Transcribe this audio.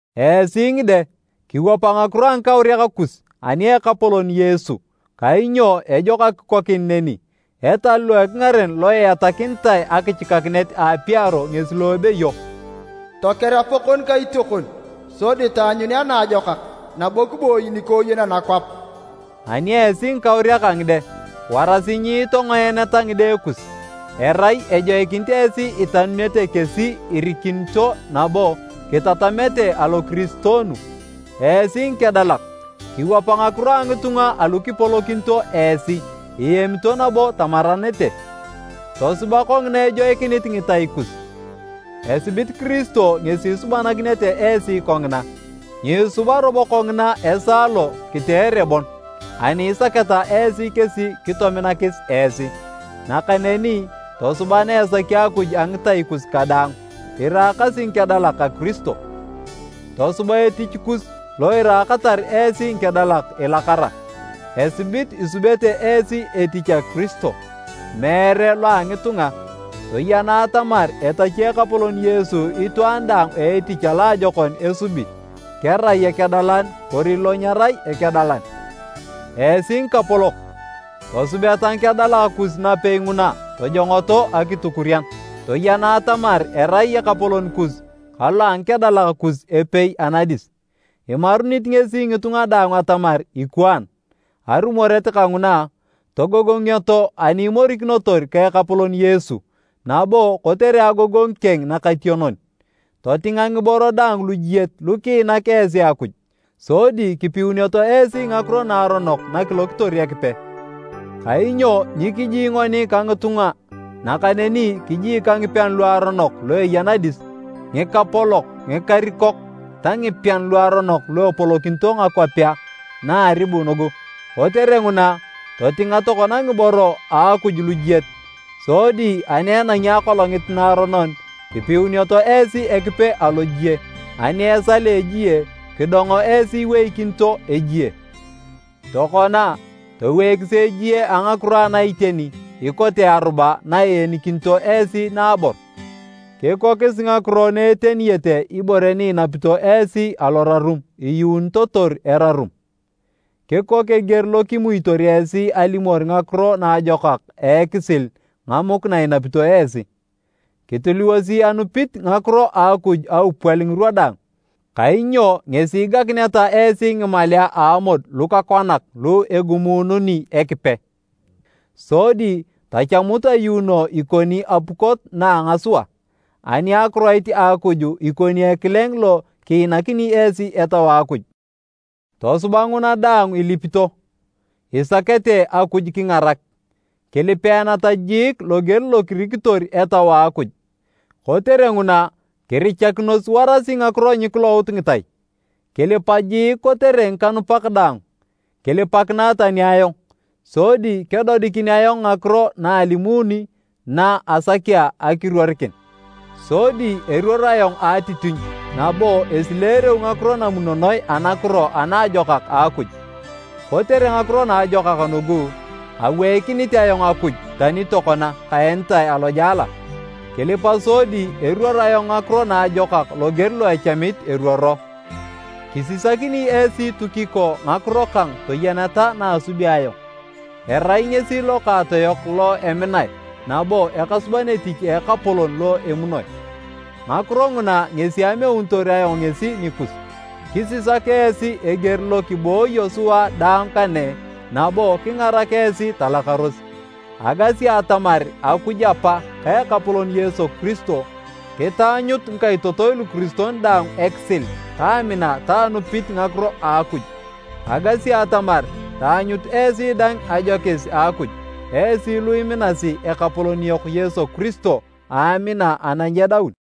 Esi ngide, kiwapa ngakiro a ngikauriak kus ani a Ekapolon Yesu, kainyo ejok akikokin neni. Etal lo ekingaren lo iatakinitae akichikakinet a apiaro ngesi lo ebeyo, “Toker apakon ka itiokon, sodi taanyunea naajokak, nabo kiboi nikooyen anakwap.” Ani esi ngikauriak a ngide, warasi nyiitongoeneta ngide kus, erai ejoikinit esi itanunete kesi irikinito nabo kitatamete alokiristoonu. Esi ngikedalak, kiwapa ngakiro a ngitunga alu kipolokinito esi iemito nabo tamaranete, tosuba kongina ejoikinit ngitai kus, esibit Kiristo ngesi isubanakinete esi kongina. Nyiisuba robo kongina esaa lo kiteere bon ani isaketa esi kesi kitominakis esi, nakaneni tosuba na esaki Akuj a ngitai kus kadaang, iraakasi ngikedalak a Kiristo. Tosuba etich kus lo iraakatar esi ngikedalak ilakara, esibit isubete esi etich a Kiristo, meere lo a ngitunga. Toyena atamar etachi Ekapolon Yesu itwaan daang a etich aloajokon esubi, kerai ekedalan kori lo nyerai ekedalan. Esi ngikapolok, tosubeta ngikedalak kus napei nguna tojongoto akitukurian. Toyena atamar erai Ekapolon kus ka lo a ngikedalak kus epei anadis, imarunit ngesi ngitunga daang atamar ikwaan. Arumoret kanguna, togogongioto ani imorikinotor ka Ekapolon Yesu nabo kotere agogongu keng nakationon. Totinga ngiboro daang lujiet lukiinak esi Akuj, sodi kipiunioto esi ngakiro naaronok nakilokitor Ekipe. Kainyo nyikiji ngoni ka ngitunga nakaneni kiji ka ngipean luaronok lu eya nadis, ngikapolok, ngikarikok ta ngipean luaronok lu epolokinito ngakwapea na a aribu nugu. Kotere nguna, totinga tokona ngiboro a Akuj lujiet! Sodi ani enangi akolongit naaronon, kipiunioto esi Ekipe alojie, ani esal a ejie, kidongo esi iweikinito ejie. Tokona, toweikisi ejie a ngakiro ana iteni ikote aruba na iinikinito esi naabor, kikokis ngakiro na eteniyete ibore ni inapito esi alorarum iyuunitotor erarum. Kikok eger lo kimuitor esi alimor Ngakiro Naajokak a ekisil ngamuk na inapito esi. Kitiliwosi anupit ngakiro a Akuj aupwal ngirwa daang, kainyo ngesi igakineta esi ngimalea a amod lukakwanak lu egumuununi Ekipe. Sodi tachamut ayuuno ikoni apukot na a ngasua, ani akiroit a Akuj ikoni ekileng lo kiinakini esi Etau a Akuj. Tosuba nguna daang ilipito, isakete Akuj kingarak. Kilipeeneta jiik loger lo kirikitor Etau a Akuj. Kotere nguna kirichakinos warasi ngakiro nyikilout ngitai, kilipa jiik kotere ngikanupak daang. Kilipakinae tani ayong, sodi kedodikin ayong ngakiro na alimuni na asakea akiruorikin, sodi eruor ayong a atitinyu nabo esileereu ngakiro namunonoe anakiro ana ajokak a Akuj. Kotere ngakiro naajokak nugu, aweikinit ayong Akuj tani tokona kaenitae alojela. Kilipa sodi eruoror ayong ngakiro naajokak loger lo echamit eruoro. Kisisakini esi Tukiko ngakiro kang toyeneta na asubi ayong. Erai ngesi lokaatoyok lo eminae nabo ekasuban etich a Ekapolon lo emunoi. Ngakiro nguna ngesi ameunitor ayong ngesi nikus, kisisak esi eger lo kibooyo sua daang kane nabo kingarak esi talakaros. Agasi atamar Akuj Apa ka Ekapolon Yesu Kiristo, kitaanyut ngikaitotoi lukiristoi daang ekisil ka amina ta anupit ngakiro a Akuj. Agasi atamar taanyut esi daang ajokis a Akuj, esi lu iminasi Ekapolon yok Yesu Kiristo a amina ana nyedaun.